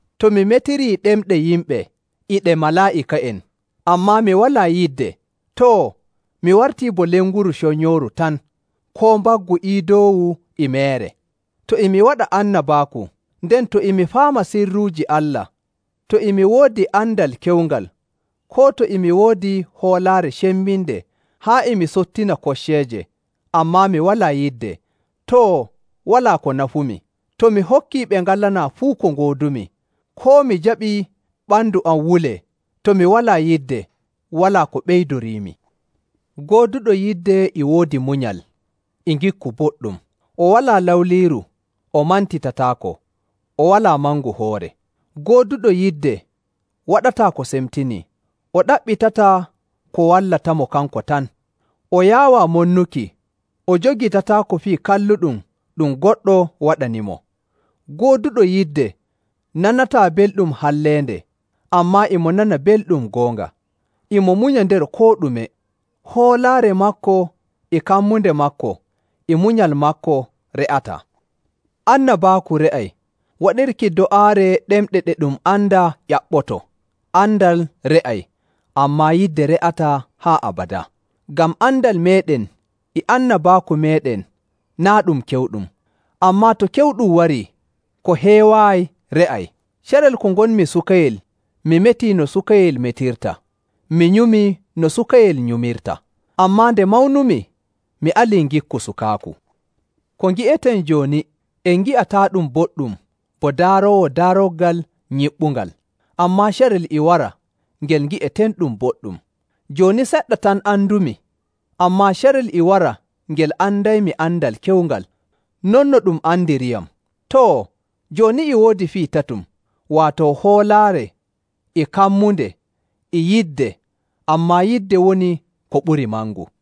To mi metirii ɗemɗe yimɓe e ɗe malaa'ika'en, ammaa mi walaa yidde, too, mi wartii bo lenguru conyooru tan, koo mbaggu iidoowu e meere. To e mi waɗa annabaaku, nden to e mi faama sirruuji Allah, to e mi woodi andal kewngal, koo to e mi woodi hoolaare cembinde haa e mi sottina kocceeje, ammaa mi walaa yidde, too, walaa ko nafumi. To mi hokkii ɓe ngalanaa fuu ko ngoodumi, koo mi jaɓii ɓandu am wulee, to mi walaa yidde, walaa ko ɓeydoriimi. Gooduɗo yidde e woodi munyal, e ngikku boɗɗum. O walaa lawliiru, o mantitataako, o walaa mangu hoore. Gooduɗo yidde waɗataa ko semtinii, o ɗaɓɓitataa ko wallatamo kanko tan. O yaawaa monnuki, o jogitataako fii kalluɗum ɗum goɗɗo waɗanimo. Gooduɗo yidde nanataa belɗum halleende, ammaa e mo nana belɗum goonga. E mo munya nder koo ɗume. Hoolaare maako, e kammunde maako, e munyal maako re'ataa. Annabaaku re'ay, waɗirki do'aare ɗemɗe ɗe ɗum andaa ƴaɓɓoto, andal re'ay, ammaa yidde re'ataa haa abadaa. Ngam andal meeɗen e annabaaku meeɗen naa' ɗum kewɗum, ammaa to kewɗum warii, ko heewaayi re'ay. Carel ko ngonmi sukayel, mi metii no sukayel metirta, mi nyumii no sukayel nyumirta. Ammaa nde mawnumi, mi alii ngikku sukaaku. Ko ngi'eten jooni, en ngi'ataaɗum boɗɗum bo daaroowo daaroggal nyiɓɓungal, ammaa carel e wara ngel ngi'etenɗum boɗɗum. Jooni seɗɗa tan andumi, ammaa carel e wara ngel andaymi andal kewngal, non no ɗum andiriyam. Too, jooni e woodi fii tatum, waato hoolaare, e kammunde, e yidde, ammaa yidde woni ko ɓurii mangu.